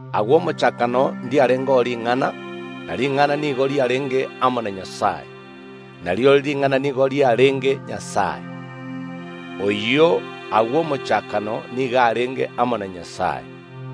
Agwo omochakano ndiarengeo Ring’ana, ne Ring’ana nigo riarenge amo na Nyasae, na rirorio Ring’ana nigo riarenge Nyasae. Oyio agwo omochakano nigo arenge amo na Nyasae.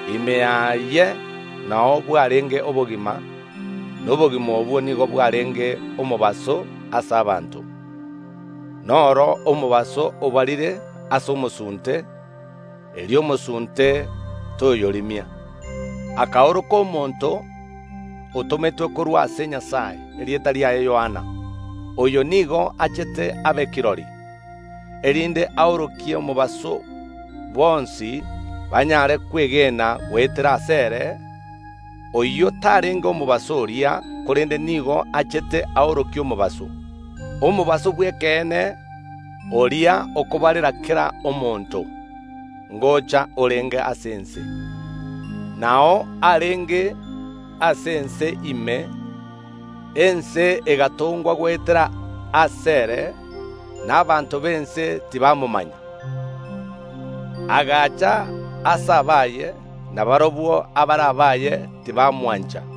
Ime yaye nao bwarenge obogima; na obogima obwo nigo bwarenge oborabu ase mwanyabaanto. Noro omobaso obarire ase omosunte, erio omosunte toyorimia. Narengeo omonto oyomo, otometwe korwa ase Nyasae, erieta riaye Yohana. Oyo nigo achete abe kirori, erinde aorokie omobaso, bonsi banyare kwegena goetera asere. Oyio tarenge omobaso oria, korende nigo achete aorokie omobaso. Omobaso bw’ekeene, oria okobarera kera omonto, ngocha orenge ase ense. Nao arenge ase ense ime, ense egatongwa goetera asere, na abanto b’ense tibamomanya. Agaacha ase abaye, na barabwo abaare abaye tibamwancha.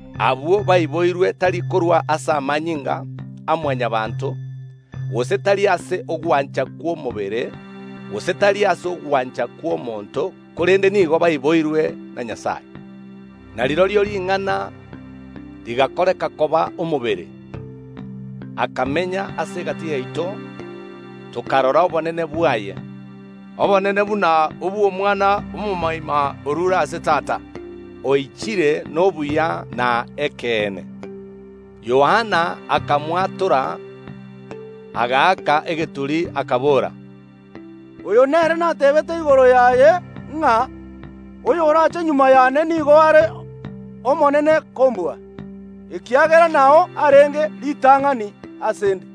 Abwo baiboirwe, tari korwa ase amanyinga a Mwanyabaanto, gose tari ase ogwancha kw’omobere, gose tari ase ogwancha kw’omonto, korende nigo baiboirwe na Nyasae. Na rirorio Ring’ana rigakoreka koba omobere, akamenya ase egati yaito. Tokarora obonene bwaye, obonene buna obw’Omwana omomoima oruure ase Tata, oichire nobuya na ekeene. Yohana agakwana igoro yaye, agaaka egeturi, akabora, “Oyo nere nateebete igoro yaye ng’a: Oyorache magega yane nigo are omonene kombua, ekiagera nao arenge ritang’ani ase ’nde.”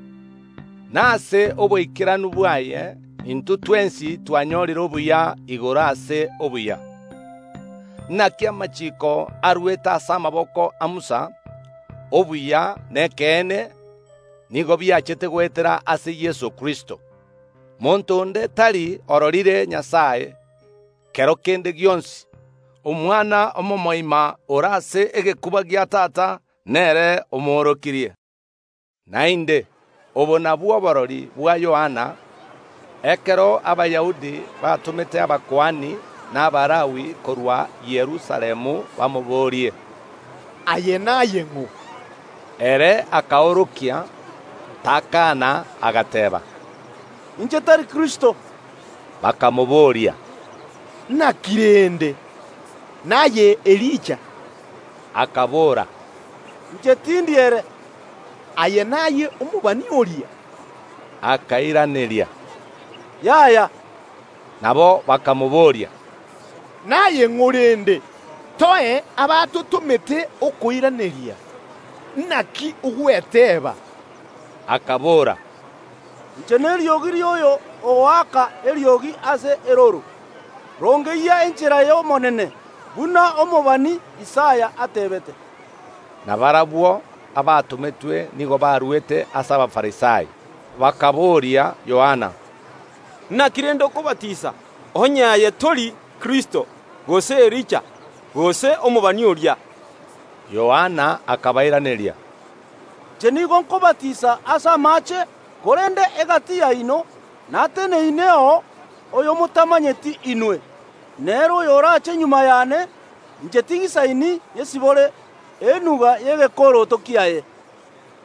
Na ase oboikeranu bwaye intwe twensi twanyorire obuya igoro ase obuya. Naki amachiiko arwerete ase amaboko a Musa, obuya na ekeene nigo biachete goetera ase Yeso Kristo. Monto onde tari ororire Nyasae kero kende gionsi; Omwana omomoima ore ase egekuba gia Tata, nere omoorokirie. Naende obo nabwo oborori bwa Yohana, ekero Abayahudi batomete abakuani na Abalawi korwa Yerusalemu bamoboorie, “Aye naye ng’o?” Ere akaorokia, takaana, agateeba, “Inche tari Kristo.” Bakamobooria, “Naki rende? Naye Elija?” Akaboora, “Inche tindi ere.” “Aye naye omobani oria?” Akairaneria, “Yaya.” Nabo bakamobooria, “Naye ng’o rende? Toe abatotomete okoiraneria. Naki ogweteeba?” Akabora, “Inche neriogi ri’oyo ogoaka egeturi ase erooro: Rongeyia enchera y’Omonene, buna omobani Isaya ateebete.” Na barabwo abatometwe nigo barwete ase Abafarisai. Bakaboria Yohana, “Naki rende okobatisa, onye aye tori Kristo, gose Elija, gose omobani?” Yohana akabairaneria, “Inche nigo nkobatisa ase amaache, korende egati yaino nateneineo oyomotamanyeti inwe. Nere oyoraache magega yane, inche tinyisaini nyesibore enuga y’egekoroto kiaye.”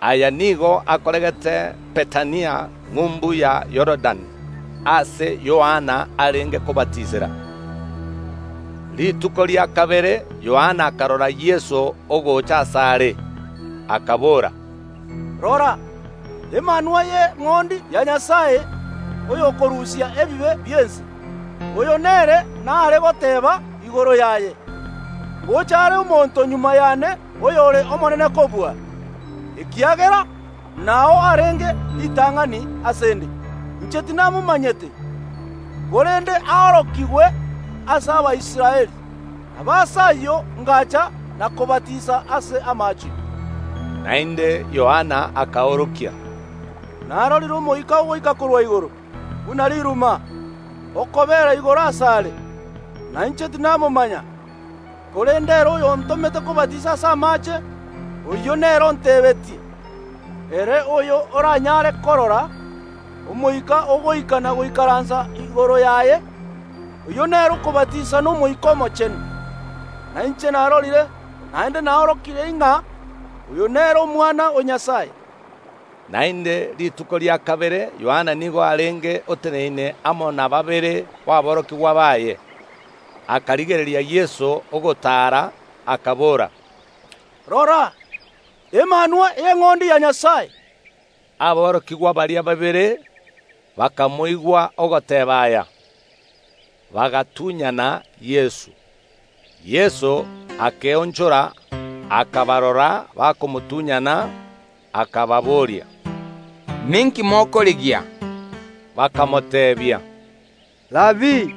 Aya nigo akoregete Bethania ng’umbu ya Yorodani, aase Yohana arenge kobatisera. Rituko ria kabere Yohana akarora Yeso ogocha asaare, akabora, “Rora, Emanwa y’Eng’ondi ya Nyasae, oyokorusia ebibe bi’ense! Oyo nere naare goteeba igoro yaye: Ngocha are omonto magega yane oyore omonene kombua, ekiagera nao arenge ritang’ani ase ’nde. Inche tinamomanyete; korende aorokigwe ase Abaisraeli, nabo ase ayio ngacha na kobatisa ase amaache.” Naende Yohana akaorokia, “Narorire Omoika ogoika korwa igoro buna riruma, okobeera igoro asare. Na inche tinamomanya, korende ere oyontomete kobatisa ase amaache, oyio nere ontebetie: Ere oyo oranyare korora Omoika ogoika na goikaransa igoro yaye, oyio nere okobatisa n’Omoika Omochenu. Na inche narorire, naende naorokirie ng’a oyo nere Omwana o Nyasae.” Naende rituko riare kobwatia Yohana nigo arenge oteneine amo na babere baborokigwa baye. Akarigereria Yeso ogotaara, akabora, “Rora, Emanwa y’Eng’ondi ya Nyasae!” Aborokigwa baria babere bakamoigwa ogoteeba aya, bagatunyana Yeso. Yeso akeonchora, akabarora bakomotunyana, akababoria, “Ninki mokorigia?” Bakamoteebia, “Rabii”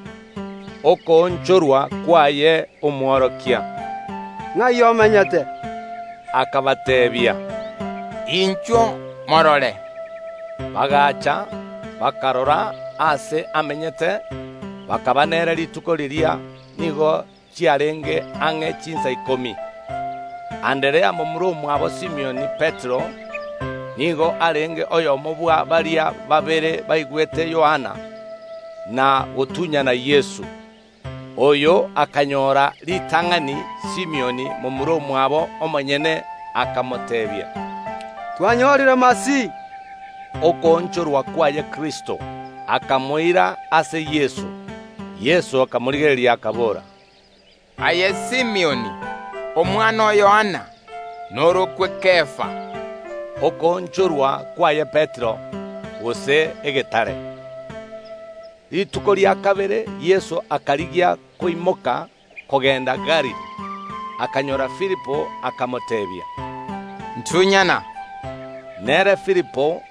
(okoonchorwa kwaye Omworokia), “nga’i omenyete?” Akabateebia, “Inchuo morore.” Bagaacha, bakarora aase amenyete, bakaba nere rituko riria; nigo chiarenge ang’e chinsa ikomi. Anderea, momura omwabo Simioni Petero, nigo arenge oyomo bwa baria babere baigwete Yohana, na gotunyana Yeso. Oyo akanyora ritang’ani Simioni momura omwabo omonyene, akamoteebia, “Twanyorire Masihi” (okoonchorwa kwaye Kristo). Akamoira ase Yeso. Yeso akamorigereria, akabora, “Aye Simioni, omwana o Yohana, norokwe Kefa” (okoonchorwa kwaye Petero, gose rigena). Rituko rikobwatia Yeso akarigia koimoka kogenda Galili. Akanyoora Filipo, akamoteebia, “Ntunyana.” Nere Filipo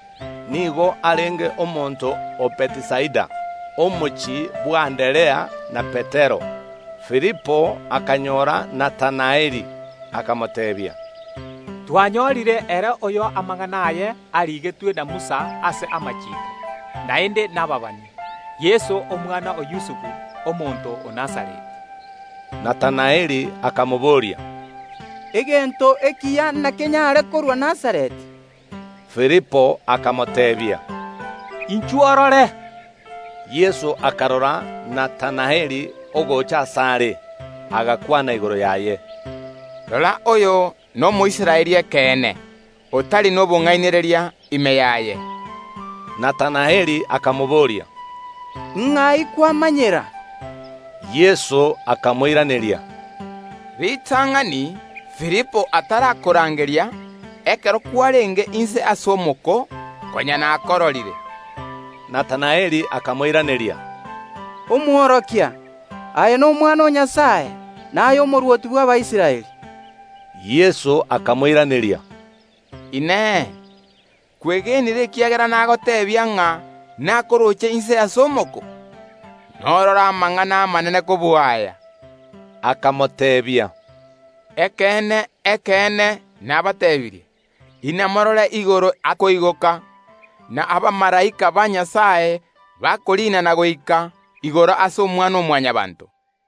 nigo arenge omonto o Bethisaida, omochie bw’Anderea na Petero. Filipo akanyoora Natanaeli, akamoteebia, “Twanyorire ere oyo amang’ana aye arigetwe na Musa ase amachiiko, naende nababani, Yeso omwana o Yusufu, omonto o Nazareti.” Natanaeli akamobooria, “Egento ekiya nakenyare korwa Nazareti?” Filipo akamoteebia, “Inchuo orore.” Yeso akarora Natanaeli ogocha asare, agakwana igoro yaye, “Rora oyo n’Omoisraeli ekeene, otari nobong’ainereria ime yaye!” Natanaeli akamobooria, “Ing’ai kwamanyera?” Yeso akamoiraneria, “Ritang’ani Filipo atarakorangeria, ekero kwarenge inse ase omoko, konya nakororire.” Natanaeli akamoiraneria, “Omworokia, aye n’Omwana o Nyasae, naye Omorwoti bw’Abaisraeli.” Yeso akamoiraneria, “Inee! Kwegenire ekiagera nagoteebia ng’a nakorooche inse ase omoko? Norore amang’ana amanene kobua aya.” Akabateebia, “Ekeene, ekeene, nabateebirie: Inamorore igoro akoigoka, na abamalaika ba Nyasae bakoriina na goika igoro ase Omwana‐o‐Mwanyabaanto.”